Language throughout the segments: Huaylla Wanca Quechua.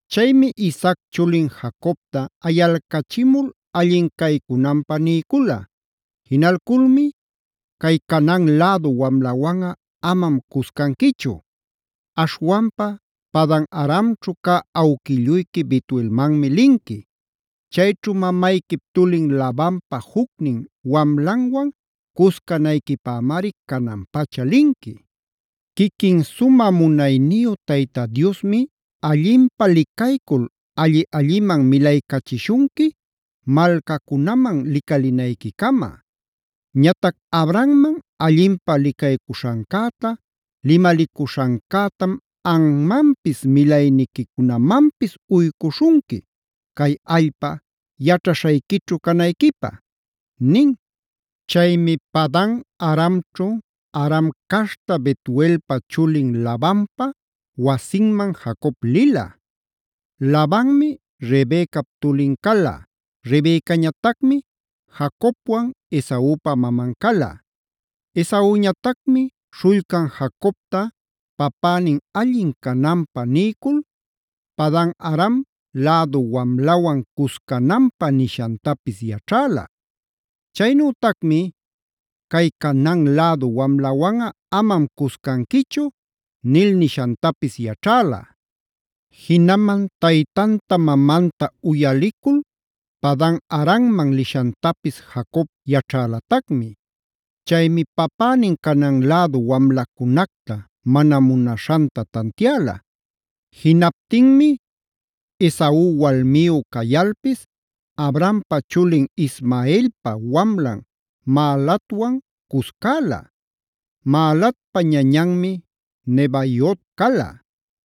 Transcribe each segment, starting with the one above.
Chaymi Isaac chulin Jacobta ayalcachimul allin caycunanpä niycula. Jinalculmi: “Cay Canaan lädu wamlawanꞌa amam cuscanquichu. Aśhwanpa Padan-aramćhu cä awquilluyqui Betuelmanmi linqui. Chayćhu mamayquip tulin Labanpa jucnin wamlanwan cuscanayquipämari canan-pacha linqui. Quiquin sumä munayniyu Tayta Diosmi allinpä licaycul alli-alliman milaycachishunqui malcacunaman licalinayquicama. Ñatac Abrahamman allinpä licaycuśhancäta, limalicuśhancätam anmanpis milayniquicunamanpis uycuśhunqui, cay allpa yaćhaśhayquićhu canayquipä”a nin. Chaymi Padan-aramćhu Aram caśhta Betuelpa chulin Labanpa wasinman Jacob lila. Labanmi Rebecap tulin cala. Rebecañatacmi Jacobwan Esaupa maman cala. Esauñatacmi śhullcan Jacobta papänin allin cananpä niycul, Padan-aram lädu wamlawan cuscananpä nishantapis yaćhäla. Chaynütacmi: “Cay Canaan lädu wamlawanꞌa amam cuscanquichu” nil nishantapis yaćhäla. Jinaman taytanta mamanta uyalicul Padan-aramman lishantapis Jacob yaćhälatacmi. Chaymi papänin Canaan lädu wamlacunacta mana munaśhanta tantiäla. Jinaptinmi Esau walmiyu cayalpis Abrahampa chulin Ismaelpa wamlan Mahalatwan cuscäla. Mahalatpa ñañanmi Nebaiot cala.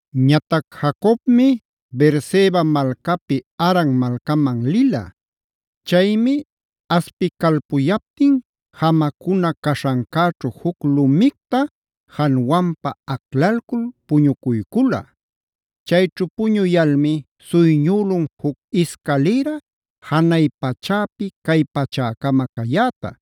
Ñatac Jacobmi Beerseba malcapi Haran malcaman lila. Chaymi aspicalpuyaptin jamacuna caśhancäćhu juc lumicta januanpä aclalcul puñucuycula. Chayćhu puñuyalmi suyñülun juc iscalïra janay pachäpi cay pachäcama cayäta.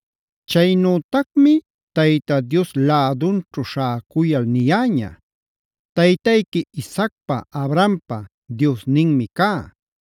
Chaynütacmi Tayta Dios lädunćhu śhäcuyal niyäña: “Taytayqui Isaacpa Abrahampa Diosninmi cá;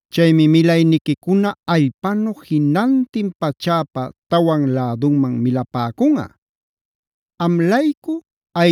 Chaymi milayniquicuna allpanu jinantin pachäpa tawan läduman milapäcunꞌa. Am-laycu,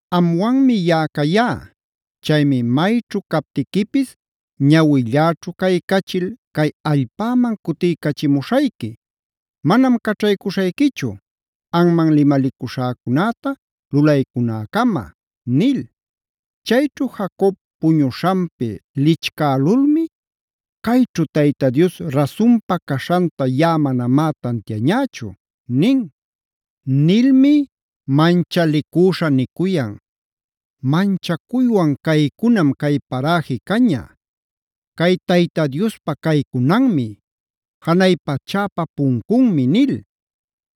Amwanmi yaꞌa cayá. Chaymi mayćhu captiquipis ñawilläćhu caycachil, cay allpaman cutiycachimuśhayqui. Manam caćhaycuśhayquichu anman limalicuśhäcunäta lulaycunäcama” nil. Chayćhu Jacob puñuśhanpi lichcälulmi: “Cayćhu Tayta Dios rasunpa caśhanta yaꞌa manamá tantiañächu” nin. Nilmi manchalicüśha nicuyan: “¡Manchacuywan caycunam cay paräji caña! Cay Tayta Diospa caycunanmi. Janay pachäpa puncunmi” nil.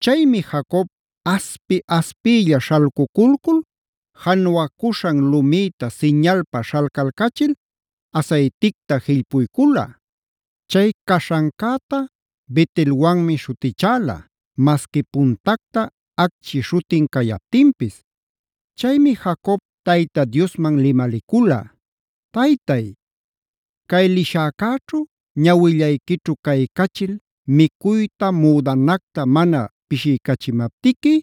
Chaymi Jacob aspi-aspiylla śhalcuculcul januacuśhan lumïta siñalpa śhalcalcachil asayticta jillpuycula. Chay caśhancäta Bet-elwanmi śhutichäla, masqui puntacta Acchi śhutin cayaptinpis. Chaymi Jacob Tayta Diosman limalicula: “Taytay, cay lishäcäćhu ñawillayquićhu caycachil micuyta müdanacta mana pishiycachimaptiqui,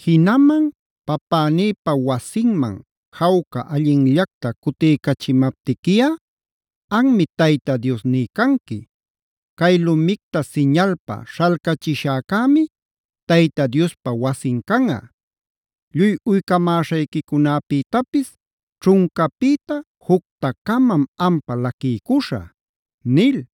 jinaman papänïpa wasinman jawca allinllacta cutiycachimaptiquiꞌa, anmi Tayta Diosní canqui. Cay lumicta siñalpa śhalcachishäcämi Tayta Diospa wasin canꞌa. Lluy uycamäśhayquicunäpïtapis ćhuncapïta jucta-camam ampa laquiycuśhä” nil.